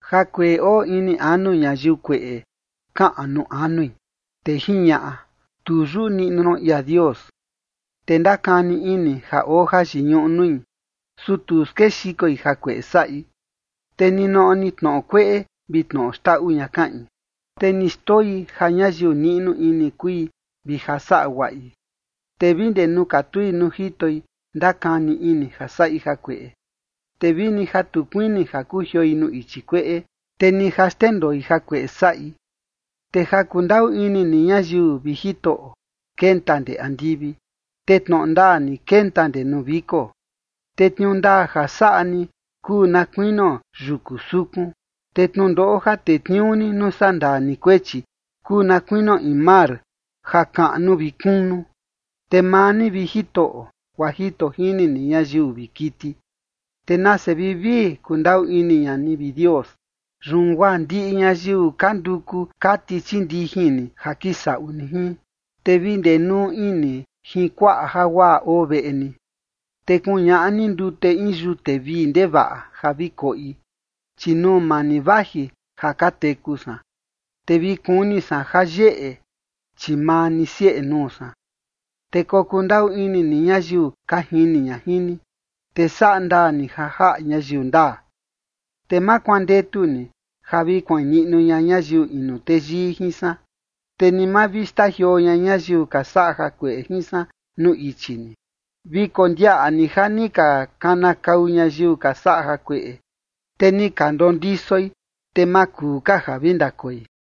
Jakueꞌe oo ini anu ñayiu kueꞌe kaꞌan nuu anui, te jiñaꞌa: “Tu yuꞌu niꞌnu ron ia Dios”. Te ndakani ini ja oo jayiñuꞌu nui, su tu skexikoi jakueꞌe saꞌi. Te ninoꞌo ni tnoꞌo kueꞌe vi tnoꞌo xndaꞌu ña kaꞌin, te ni xndoi ja ñayiu niꞌnu ini kui, vi ja saꞌa guaꞌi. Te vi ndee nuu katui nuu jitoi, ndakani ini ja saꞌi jakueꞌe, te vini ja tu kuini ja kujioi nuu ichi kueꞌe, te ni ja xndendoi jakueꞌe saꞌi. Te ja kundaꞌu ini ni ñayiu, vi Jitoꞌo, kenta ndee andivi, te tnoꞌo ndaa ni, kenta ndee nuu viko. Te tniuu ndaa ja saꞌa ni kuu na kuinio yuku sukun, te tnundoꞌo ja tetniuu ni nuu sandaa ni kuechi kuu na kuinio in mar ja kaꞌnu vi kunu. Te maa ni, vi Jitoꞌo, guaa jito jini ni ñayiu vi kiti. Te nase vivii kundaꞌu ini ña ni, vi Dios. Yun guaa ndiꞌi ñayiu ka nduku kati chii ndijin ni ja kisaꞌu ni jin. Te vi ndenuu ini jin kuaꞌa jaguaꞌa oo veꞌe ni, te kuñaꞌa ni ndute in yute vii ndevaꞌa ja vi koꞌi. Chi nuu maa ni vaji ja ka teku san, te vi kuni san jayeꞌe, chi maa ni sieꞌe nuu san. Te kokundaꞌu ini ni ñayiu ka jini ña jin ni, te saꞌa ndaa ni ja jaꞌa ñayiu ndaa. Te ma kuandetu ni ja vi kuain niꞌnu ña ñayiu inu teyii jin san, te ni ma vi xtajioo ña ñayiu ka saꞌa jakueꞌe jin san nuu ichi ni. Vi kondiaꞌa ni ja ni ka kanakau ñayiu ka saꞌa jakueꞌe. Te ni ka ndondisoi, te ma kuu ka ja vi ndakoi.